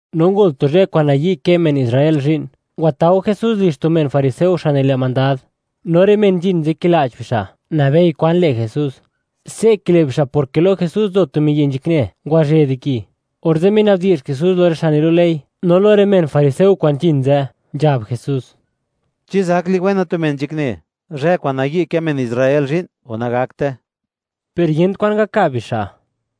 No ngol tu zhë kwa'n nayi' kë men Israel zhi'n, ngwatao Jesús lizh tu men fariseo, xa' nile' mandad, no rë men zhin ze' kila'ch bixa', nabei kwan le' Jesús. Se' kile' bixa' porke lo Jesús nzo tu miyi' nzhakne, ngwazhë di ki. Orze' minabdi'zh Jesús lo rë xa' nilu' ley, no lo rë men fariseo kwa'n nzhin ze', nzhab Jesús: ―¿Chi zak liwena tu men nzhakne, zhë kwa'n nayi' kë men Israel zhi'n, o nagakte? Per yent kwan ngakab bixa'.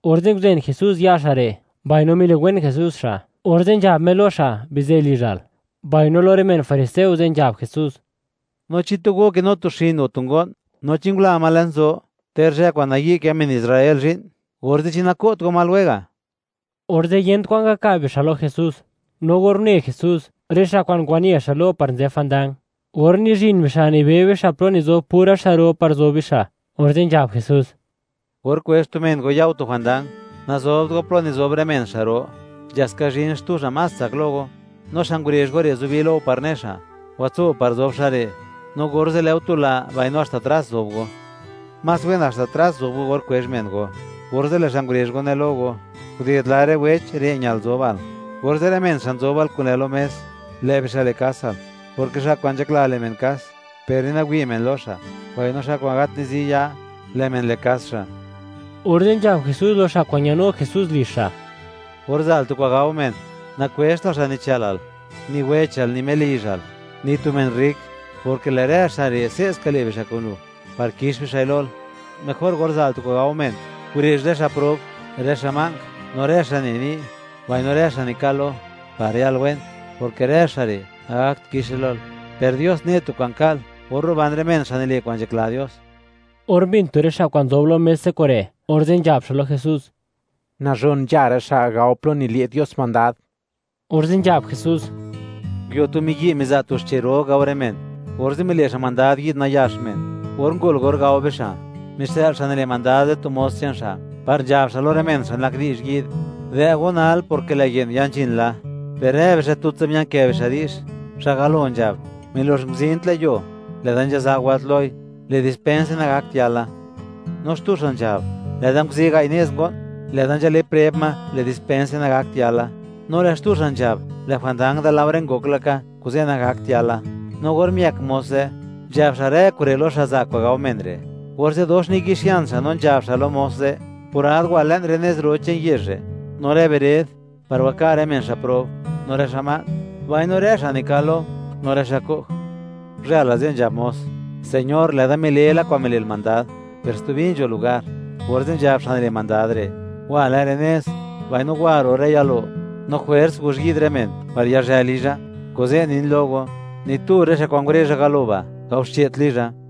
Orze' nguzen Jesús ya' xa' re', mbaino miliwen Jesús xa', orze' nzhab Me lo xa': “Bizë lizhal.” Mbaino lo rë men fariseo ze' nzhab Jesús: ―No chi tu go kinu tu xin, o tu ngo'n, no chi ngula ma le'n zo, ter zhë kwa'n nayi' kë men Israel zhi'n, orze', ¿chi nako't go ma lwega'? Orze' yent kwan ngakab bixa' lo Jesús. No or une Jesús, rë xa' kwa'n ngwane xa' lo par nzë jwandang, or nizhin bixa', nibe bixa' plo nizob pura xa' ro par zob bixa', orze' nzhab Jesús: ―Or kwezh tu men go ya go tu jwandang, nazobt go plo nizob rë men xa' ro, nzha ska zhin xtu xa' más tsak lo go, no xa' ngurezh go re' zubi lo go par ne xa': “Watso par zob xa' re'”, no orze' lë' go tula, mbaino haxta tras zob go. Más wen haxta tras zob go or kwezh men go, orze' lë' xa' ngurezh go ne lo go: “Guded lare' weech, re' ñal zobal”, orze' rë men xa' nzobal kun lë' lo mes, lë' bixa' le' kasal, porke xa' kwa'n nzhakla le' men kas, per ni nawi' men lo xa'; mbaino xa' kwa'n gat nizi ya, lë' men le' kas xa'. Orze', nzhab Jesús lo xa' kwa'n ñanu Jesús lizh xa': ―Or za'l tu kwa'n gao men, nakwezhtal xa' nichë'lal, ni wechal, ni melizhal, ni tu men rrik; porke lë' rë xa' re', se'ska le' bixa' kun lu, par kix bixa'i lol. Mejor or za'l tu kwa'n gao men, gurezh rë xa' prob, rë xa' ma'nk, no rë xa' ne ni', mbaino rë xa' nikal lo, par yal wen; porke rë xa' re', nagakt kixe lol; per Dios ne' tu kwa'n ka'l or ruban rë men xa' nile' kwa'n nzhakla Dios. Or mbin tu rë xa' kwa'n nzob lo mes ze' kure', orze' nzhab xa' lo Jesús: ―¡Nazhon nzha rë xa' gao plo nile' Dios mandad! Orze' nzhab Jesús: ―Nguio tu miyi' miza' tu xche' ro gao rë men, orze' mile' xa' mandad yi'd nayax men. Or ngol or gao bixa', mixë'l xa' nile' mandad ze' tu mos che'n xa', par nzhab xa' lo rë men xa' nak di'zh yi'd: “Dë' go nal, porke lë' ye'n ya nzhin la.” Per rë bixa' tutsa mia'nkë bixa' di'zh. Xa' galo nzhab: “Milox nguzin tlë' yuo, lë'da nzha za wëlt loi. Le' dispense, nagakt yala.” No xtu xa' nzhab: “Lë'da nguzi' gai' nez ngo'n, lë'da nzhale' preb ma; le' dispense, nagakt yala.” No lë' xtu xa' nzhab: “Lë' jwandang da laore ngok laka; kuze' nagakt yala.” No or miëk mos ze', nzhab xa' rë kure' lo xa' za' kwa'n gao men re'. Orze' dox niyi'xian xa', no nzhab xa' lo mos ze': “Le' purad, le'n rë nez ro che'n yezh re', no rë bered, par waka' rë men xa' prob, no rë xa' ma'nk, mbaino rë xa' nikal lo, no rë xa' ko'j.” Guzhël la ze' nzhab mos: “Señor, lë'da mile la kwa'n mile'l mandad, per stubi nzho lugar.” Orze' nzhab xa' nile' mandad re': “Wa le'n rë nez, mbaino wa ro' rë yalo, no jwers guzh yi'd rë men, par yazhë lizha. Kuze' nin lo go, ni tu rë xa' kwa'n ngurezha galo ba', gaoxche't lizha.”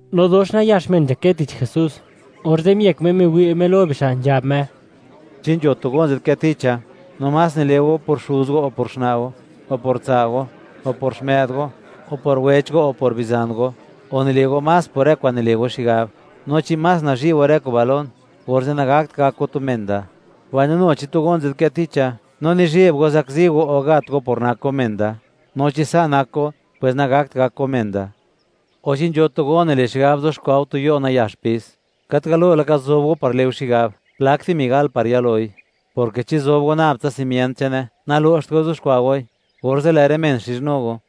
No dox nayax men nzhakë tich Jesús, orze' miëk Me, miwi' Me lo bixa', nzhab Me: ―Chi nzho tu go nzadkë ticha, no más nile' go por xuz go, o por xna' go, o por tsa' go, o por xmë'd go, o por wech go, o por bizan go, o nile' go más por rë kwa'n nile' go xigab; no chi más nazhi' go rë kuba' lon, orze' nagakt gak go tu men da. Mbaino nu chi tu go nzadkë ticha, no nizheb go zakzi go o gat go por nak go men da; no chi sa' nak go, pwes nagakt gak go men da. O chi nzho tu go nile' xigab kuxkwa' go tu yo' nayax pis, ¿gat galo laka zob go par le' go xigab, plak dimi gal par yaloi?, porke chi zob go nab tsa simient che'ne, nalo'xt go kuxkwa' goi, orze' lë' rë men xizhnu go,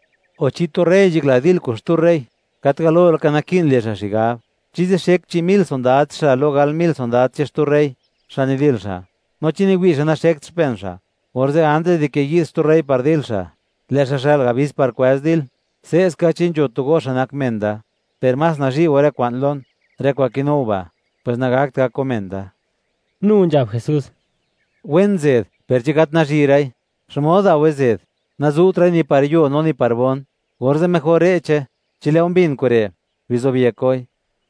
O chi tu rey nzhakla dil kun xtu rey, ¿gat galo laka naki'n le' xa' xigab, chi zixek chi' mil sondad che'n xa' lo gal mil sondad che'n xtu rey xa' nidil xa'? No chi niwi' xa' naxekt xpen xa', orze' antis di ke yi'd xtu rey par dil xa', lë' xa' xë'l abis par kwëz dil. Se'ska, chi nzho tu go xa' nak men da, per más nazhi' go rë kwa'n lon, rë kwa'n kinu go ba', pwes nagakt gak go men da. Nu nzhab Jesús: ―Wen zed, per chi gat nazhi'ra'i, ¿xmod dao'we zed? Nazu'tra'i ni par yuo, no ni par bon. Orze' mejor re'che. Chi lë' go mbin kure', bizobyek goi.